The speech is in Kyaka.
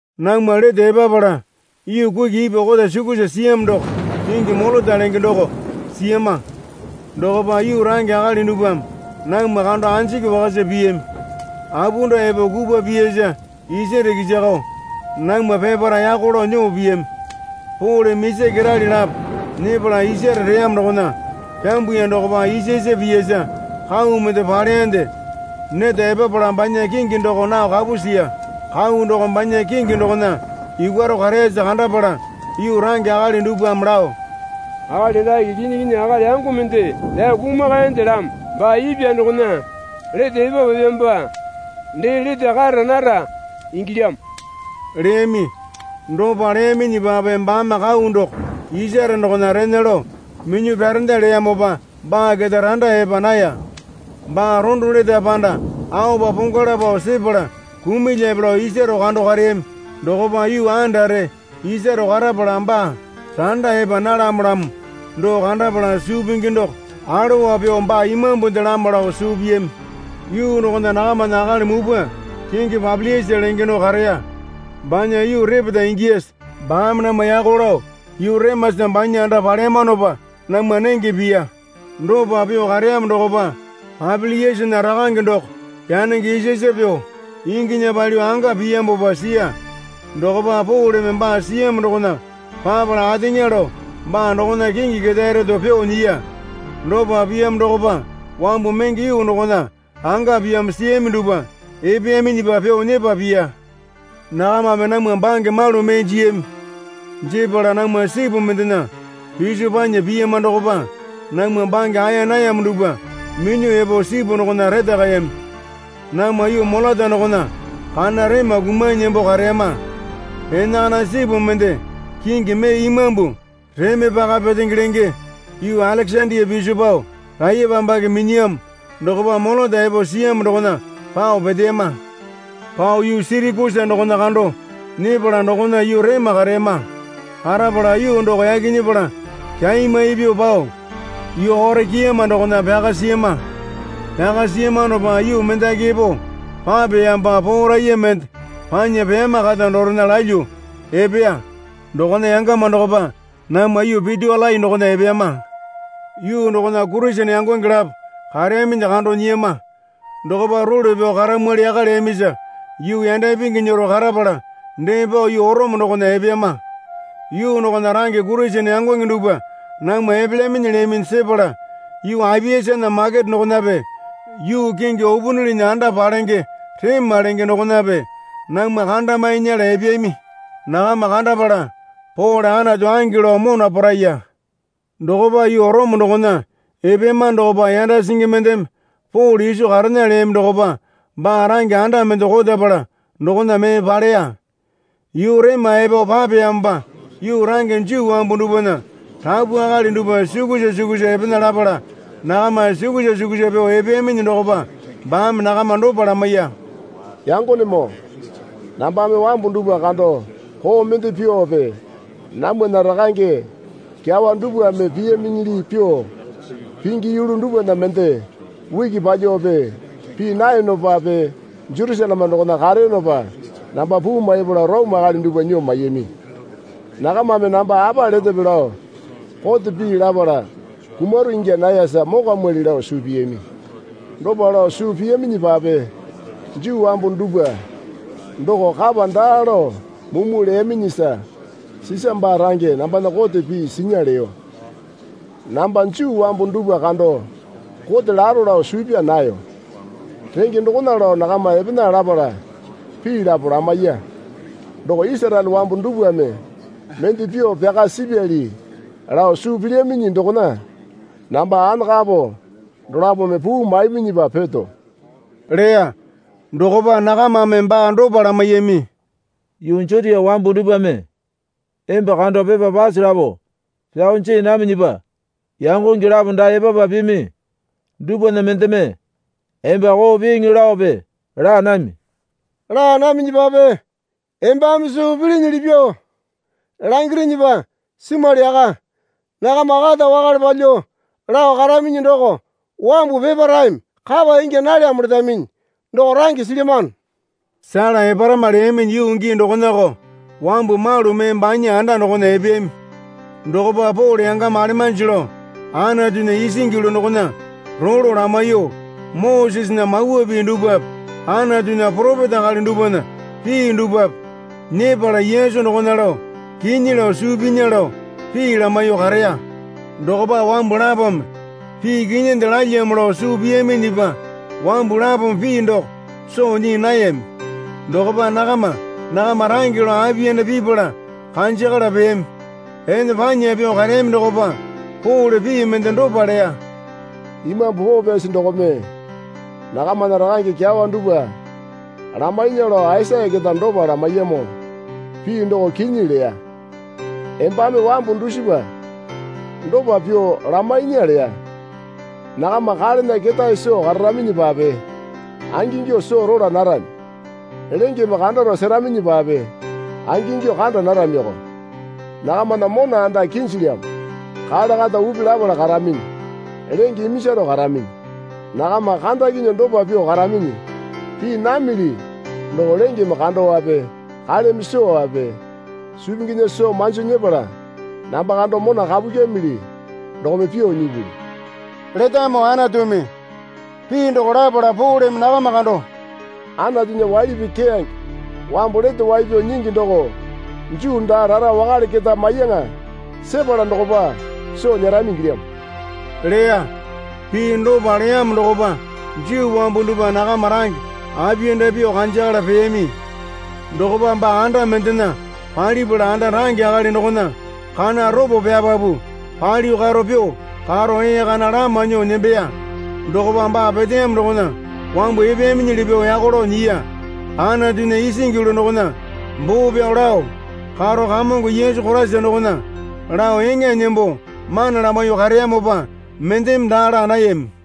Namwa lete epapala yuu kuki ipwa kota sukusa siyamo doko kingi Molota lenge doko siyama. Dokopa yuu range akali dupwame namwa kando anjiki wakasa piyami. Apunda epo kupwa piyasa isare kisakao namwa peparae yako lao nyuo piyami. Poleme isa kerali lapo nyepala isare reyamo dokona pyambuya dokopa isasa piyasa kau mende paleyande neta epapala banya kingi doko nao kapu siya. Kau doko banya kingi dokona yukwaro kareyasa kandapala yuu range akali dupwame lao, Akali dake kinyi kinyi akali yango mende pyao kumakayandelamo. Baa ipwa dokona lete epapapyamopa dee lete kara nara ingilyamo leyami. Dopa leyaminyipape baame kau doko isare dokona rena lao minyuo pyarenda leyamopa baa keta randa epa naya. Baa rondo letape panda aopa pongwala pao sepala kumulyape lao isaro kando kareyami. Dokopa yuu andare isaro karapala baa randa epa nalamolamo doko kandapala suu pingi doko alowa pyuo baa imambundelamo lao suu piyami. Yuu dokona nakamana akali mupwa kingi Papiliasa lenge doko kareya. Banya yuu repeta ingiyasa baame namwa yako lao yuu remasa banya anda paleyamanopa namwa nenge piya. Dopa pyuo kareyamo dokopa Papiliasana rakange doko yanenge isasa pyuo inginya palyuo anga piyamopa siya. Dokopa Poleme baa siyamo dokona papala ateŋa lao baa dokona kingi ketae reto pyuo nyiya. Dopa piyamo dokopa wambu menge yuu dokona anga piyamo siyami dupwa epeyaminyipa pyuo nyepa piya. Nakamame namwa bange malu mee jiyami. Jepala namwa sipu mendena piso panya piyama dokopa namwa bange aeya nayamo dupwa minyuo epo sipu dokona retakayami. Namwa yuu Molota dokona kana rema kumanyi nembo kareyama. Enakana sipu mende kingi mee imambu Reme Paka Petenge lenge yuu Alekesandia piso pao raiyepambake minyiyamo dokopa Molota epo siyamo dokona pao peteyama. Pao yuu Sirakusa doko kando nyepala dokona yuu rema kareyama. Karapala yuu doko yaki nyepala kyaimai pyuo pao yuu Orekiama dokona pyaka siyama. Pyaka siyamanopa yuu mendaki epo papeyamopa poo raiya mende panya peyama kata dorena lalyuo epeya. Dokona yangama dokopa namwa yuu Pyutiolai dokona epeyama. Yuu dokona Kurisene yangonge lapo kareyaminyi kando nyiyama. Dokopa role pyao karamwali yaka leyamisa yuu yanda ipingi nyero karapala dee pao yuu Orome dokona epeyama. Yuu dokona range Kurisene yangonge dupwa namwa epelyaminyi leyaminyi sepala Yuu Apiasana Makete dokonape yuu kingi Upunilinya Anda Palenge Rema lenge dokonape namwa kandamae nyela epeyami. Nakama kandapala Pole Anatu ange lao mona poo raiya. Dokopa yuu Orome dokona epeyamano dokopa yanda singi mendeme Pole iso karena leyami dokopa baa range anda mende kotapala dokona mee paleya. Yuu rema epo papeyamopa yuu range Juu wambu dupwana rapu akali dupwa sukusa sukusa epena lapala nakama sukusa sukusa pyuo epeyaminyi dokopa baame nakama dopa lamaiya. Yangonemoo, nambame wambu dupwa kando koo mende pyuope namwana rakange kyawa dupwame piyaminyili pyuo pingi yulu dupwana mende uki palyuope pii nayonopape Jerusaleme dokona kareyonopa namba puu maipala Orome akali dupwa nyuo maiyami. Nakamame namba apa letepe lao kote pii lapala kumaro ingya nayasa mokwamwali lao suu piyami. Dopa lao suu piyaminyipape Juu wambu dupwa doko kapa daa lao mumu leyaminyisa Sisa baa range nambana kote pii sinya leyo. Namba Juu wambu dupwa kando kote laro lao suu pyaa nayo. Renge dokona lao nakama epena lapala pii lapo lamaiya. Doko Isaraele wambu dupwame mende pyuo pyaka sipyali lao suu pilyaminyi dokona namba anakapo dolapome puu maiminyipa peto leya. Dokopa nakamame baa dopa lamaiyami. Yuu Jutia wambu dupwame emba kando pepa pase lapo pyao jii naminyipa yangonge lapo dae epapa pimi dupwana mendeme emba koo piiŋi laope laa nami. Laa naminyipape embame suu pilinyili pyuo langirinyipa simwali yaka. Nakama kata wakale palyuo lao karaminyi doko wambu peparaeme kapa ingya nalyamo letaminyi doko range silyamano. Sela eparama leyaminyi yuu gii dokonako wambu malu mee banya anda dokona epeyami. Dokopa Pole yangama alemanji lao Anatunya isingi yulu dokona rolo lamaiyuo Mosesena Mawa Pii dupwape Anatunya poropeta akali dupwana pii dupwape nyepala Yesu dokona lao kinyi lao suu pinya lao pii lamaiyuo kareya. Dokopa wambu lapome pii kinyinde lalyamo lao suu piyaminyipa wambu lapome pii doko soo nyii nayami. Dokopa nakama nakama range lao apiyanda pipala kanjakala peyami. Ene panya pyuo kareyami dokopa Pole pii mende dopa leya. Imambu Poo Pyasi dokome nakamana rakange kyawa duwpa lamainya lao Aisaya keta dopa lamaiyamo pii doko kinyi leya. Embame wambu dusipa dopa pyuo lamainya leya. Nakama kalena ketae soo kararaminyipape angingyuo soo rola narami. Lengeme kandaro separaminyipape angingyuo kanda naramiko. Nakamana mona anda kinjilyamo kale kata upi lapala karaminyi lenge iminjaro karaminyi. Nakama kandakinyuo dopa pyuo karaminyi. Pii namili doko lengeme kandowape kaleme sowape suu pinginya soo manji nyepala namba kando mona kapu kyimili dokome pyuo nyipuli, letamo Anatumi. Pii doko lapala Poleme nakama kando, Anatunya waili pii keyange wambu lete wai pyao nyingi doko Juu daa rara wakale keta maiyaŋa sepala dokopa soo nyerami ingilyamo leya. Pii dopa leyamo dokopa Juu wambu dupwa nakama range apiyanda pyuo kanjakala peyami. Dokopa baa anda mendena palipala anda range akali dokona kana ropo pyapapu palyuo karo pyuo karo ee kana lama nyuo nembeya. Dokopa baa peteyamo dokona wambu epeyaminyili pyuo yako lao nyiya. Anatunya isingi yulu dokona boo pyao lao karo Kamongo Yesu Koraisa dokona lao eŋa nembo mana lamaiyuo kareyamopa mendeme daa laa nayami.